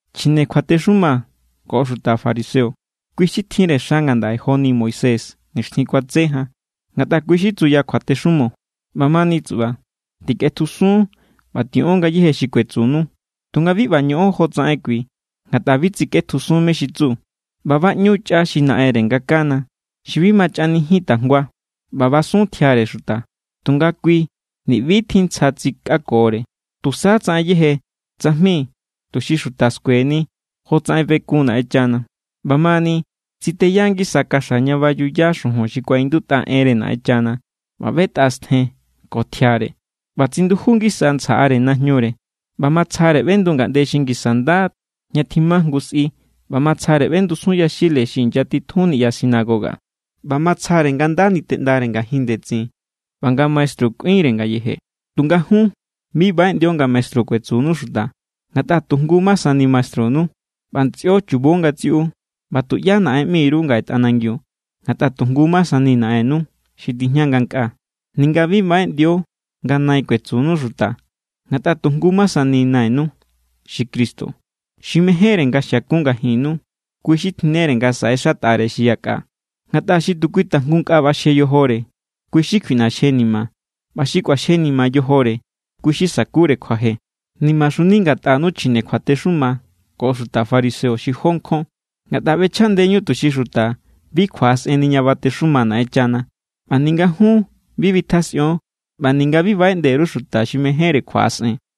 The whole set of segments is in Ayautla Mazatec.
—Chjine kjuatexuma ko xuta fariseo, kui= xi tjinre xa ngandaꞌe joni Moisés nixtjin kuatse jan, ngatꞌa kui= xi tsuya kjuatexumo. ꞌBamani tsuꞌba, tikꞌetjusun ꞌba tiꞌon ngayéje xi kuetsunu. Tunga bi ꞌba ñoꞌon jotsaꞌen kui, ngatꞌa bi tsikꞌetjusun mé= xi tsu. ꞌBa baꞌñu chꞌa xi naꞌenre nga kana, xi bi ma chꞌanijin tajngua, ꞌba basun tjiare xuta. Tunga kui ni̱ ꞌbi=tjin ntsja tsikꞌakore. Tusa tsaꞌen yeje tsajmi tuxi xuta skueni jotsaꞌen bekun Naꞌenchana. ꞌBamani tsiteya ngisa kaxa ña bayuya xujun xi kuaꞌindutꞌa enre Naꞌenchana ꞌba ꞌbetꞌa stjen ko tjiare, ꞌba tsinduju ngisa ntsjaꞌare najñure. ꞌBa matsjare ꞌbendu ngaꞌnde xi ngisa nda ña tjima jngu sꞌi ꞌba matsjare ꞌbendusun yaxile xi inyatitjun niꞌya sinagoga. ꞌBa matsjare nga nda niteꞌndare ngajin ndetsin ꞌba nga maestru kꞌuinre ngayeje. ’Tunga jun, bi baꞌeꞌndio nga maestru kuetsunu xuta, ngatꞌa tu jngu ma sani maestrunu, ꞌba ntsꞌio chubo ngatsiꞌu. ꞌBa tuꞌyá naꞌen ꞌmi_ru ngaꞌe tꞌanangiu, ngatꞌa tu jngu ma sani Naꞌennu, xi tijña ngankꞌaa. Ninga bi baꞌeꞌndio nga nai kuetsunu xuta, ngatꞌa tu jngu ma sani nainu, xi Cristo. Xi mejénre nga xiakun ngajinnu, kui= xi tjinnere nga saꞌexatꞌare xi yakꞌa. Ngatꞌa xi tu kui tajngu nkꞌa ꞌbaxje yojore, kui= xi kjuiꞌnaxjenima. ꞌBa xi kꞌuaxjenima yojore, kui= xi sakure kjuaje. ’¡Nimaxuni ngatꞌanu, chjine kjuatexuma ko xuta fariseo, xi jó nkjon! Ngatꞌa ꞌbechjaꞌndeñu tuxi xuta bi kjuaꞌasꞌenni ña batexuma Naꞌenchana. ꞌBa ninga jun bi bitjasꞌion, ꞌba ninga bi baꞌeꞌnde_ru xuta xi mejénre kjuaꞌasꞌen.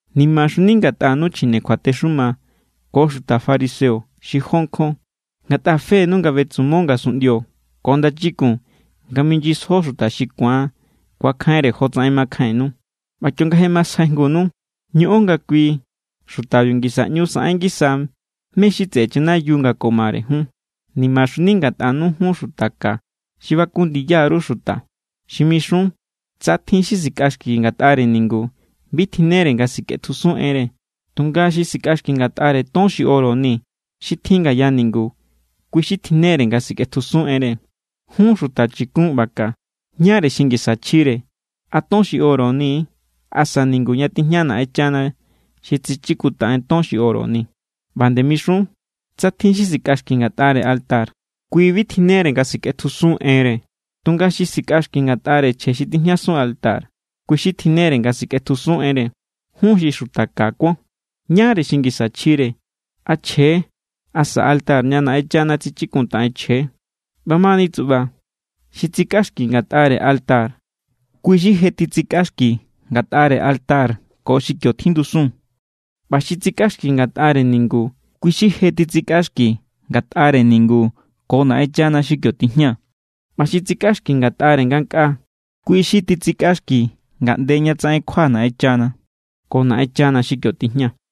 ’¡Nimaxuni ngatꞌanu, chjine kjuatexuma ko xuta fariseo, xi jó nkjon! Ngatꞌa fenu nga betsumo ngasunꞌndio ko ndachikun nga minyisjo xuta xi ku̱an ku̱akjainre jotsaꞌen makjainnu. ꞌBa kionga je masjaijngunu, ñoꞌon nga kui xutabiu ngisa ꞌñu saꞌen ngisa mé= xi tseꞌe chanayiu nga ko mare jun. ’¡Nimaxuni ngatꞌanu, jun xuta ka xi baku ndiya_ru xuta! Xi mixun: “Tsa tjin xi sikꞌaxki ngatꞌare ningu, bi tjinnere nga sikꞌetjusun enre. Tunga xi sikꞌaxki ngatꞌare ton xi oro ni xi tjin ngaya ningu, kui= xi tjinnere nga sikꞌetjusun enre.” Jun xuta chikun ꞌba ka. ¿Ñáre xi ngisa chjire? ¿A ton xi oro ni=, asa ningu ña tijña Naꞌenchana xi tsichikuntaꞌen ton xi oro ni? ꞌBa nde mixun: “Tsa tjin xi sikꞌaxki ngatꞌare altar, kui bi tjinnere nga sikꞌetjusun enre. Tunga xi sikꞌaxki ngatꞌare chje xi tijñasun altar, kui= xi tjinnere nga sikꞌetjusun enre.” Jun xi xuta ka kuon. ¿Ñáre xi ngisa chjire? ¿A chje=, asa altar ña Naꞌenchana tsichikuntaꞌen chje=? ꞌBamani tsuꞌba, xi tsikꞌaxki ngatꞌare altar, kui= xi je titsikꞌaxki ngatꞌare altar ko xi kio tjindusun. ꞌBa xi tsikꞌaxki ngatꞌare ningu, kui= xi je titsikꞌaxki ngatꞌare ningu ko Naꞌenchana xi kio tijña. ꞌBa xi tsikꞌaxki ngatꞌare ngankꞌaa, kui= xi titsikꞌaxki ngaꞌnde ña tsaꞌen kjua Naꞌenchana ko Naꞌenchana xi kio tijña.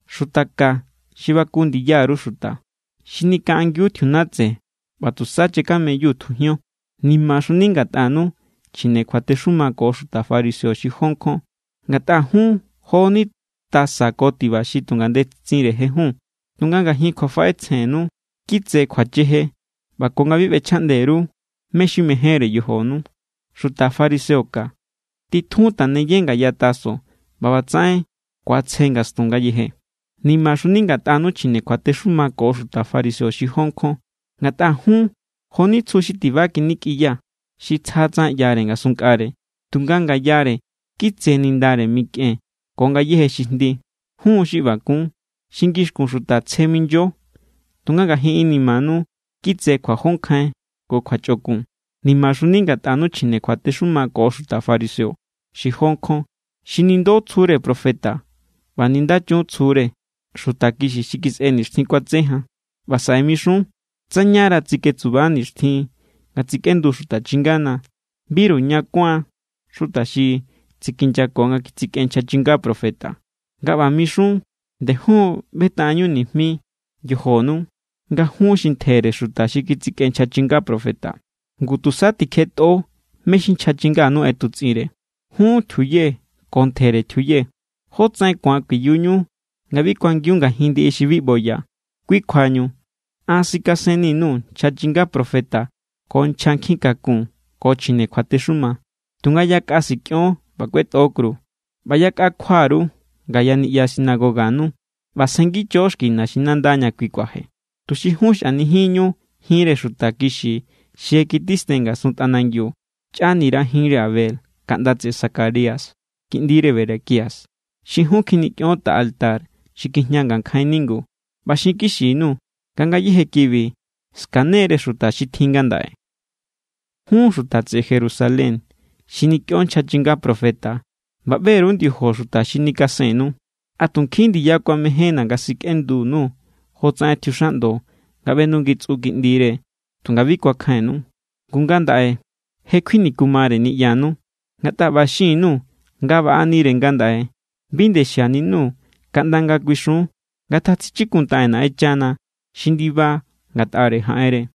Xuta ka xi baku ndiya_ru xuta. Xi nikaꞌangiu tjiunatse ꞌba tusa chakameyu tjujion. ’¡Nimaxuni ngatꞌanu, chjine kjuatexuma ko xuta fariseo, xi jó nkjon! Ngatꞌa jun jo=ni tasa ko tiba xi tu ngandetsinre jejun, tunga ngajin kjuafaꞌetsjennu kitse kjuacheje ꞌba ko nga bi ꞌbechjaꞌnde_ru mé= xi mejénre yojonu. Xuta fariseo ka, titjun taneye ngaya taso, ꞌba ꞌbatsaꞌen ku̱atsje ngastun ngayeje. ’¡Nimaxuni ngatꞌanu, chjine kjuatexuma ko xuta fariseo, xi jó nkjon! Ngatꞌa jun jo=ni tsju xi tiba kjinikꞌiya, xi tsja tsaꞌen ꞌyare ngasunnkꞌare, tunga ngayare kitse nindare mikꞌen ko ngayéje xi jndi. Jun= xi ꞌba kun, xi ngixkun xuta tsje minyo, tunga ngajin inimanu kitse kjuajonkjain ko kjuachꞌokun. ’¡Nimaxuni ngatꞌanu, chjine kjuatexuma ko xuta fariseo, xi jó nkjon! Xi nindo tsjure profeta ꞌba nindachun tsjure xuta kixi xi kisꞌe nixtjin kuatse jan. ꞌBa saꞌe mixun: “Tsa ñara tsiketsuba nixtjin nga tsikꞌendu xuta chingana, biru ña kuáan xuta xi tsikinyako nga kitsikꞌen nchja chinga profeta.” Nga ꞌba mixun, nde jun= ꞌbetaꞌenñu nijmi yojonu nga jun xi ntjere xuta xi kitsikꞌen nchja chinga profeta. Ngu, tusa tikjetꞌo mé= xi nchja chinganu ꞌetutsꞌinre. ’¡Jun tjiuye ko ntjere tjiuye! ¿Jótsaꞌen ku̱an kuiyuñu nga bi kuangiun ngajin ndiꞌi xi bi ꞌboya? Kui kjuañu, an sikasenni_nuu̱ nchja chinga profeta ko nchja nkjikakun ko chjine kjuatexuma. Tunga yakꞌa sikꞌion ꞌba kꞌuetꞌo kru, ꞌba yakꞌa kjua_ru ngaya niꞌya sinagoganu ꞌba sjengicho xki naxinanda ña kui kuaje. Tuxi jun xꞌanijinñu jinre xuta kixi xi je kitisten ngasun tꞌanangiu. Chꞌanira jinre Abel, kaꞌnda tseꞌe Zacarías kiꞌndire Berequías, xi jun kjinikꞌion tꞌa altar xi kjijña ngankjain ningu. ꞌBa xinkixi_nuu̱, nga ngayéje kibi skane=re xuta xi tjin ngandaꞌe. ’¡Jun xuta tseꞌe Jerusalén, xi nikꞌion nchja chinga profeta ꞌba ꞌbe_ru ndiojo xuta xi nikasennu! ¡A tu nkjin ndiya kuamejénna̱ nga sikꞌenduku_nuu̱ jotsaꞌen tjiuxaꞌndo nga ꞌbendungitsꞌu kiꞌndire, tunga bi kuakjainnu! Ngu ngandaꞌe, je kjuinikumare niꞌyanu. Ngatꞌa ꞌba xin_nuu̱ nga baꞌanire ngandaꞌe, bi nde xianinu kaꞌnda nga kuixun: “Ngatjatsichikuntaꞌen Naꞌenchana xi ndiba ngatꞌare jaꞌenre.”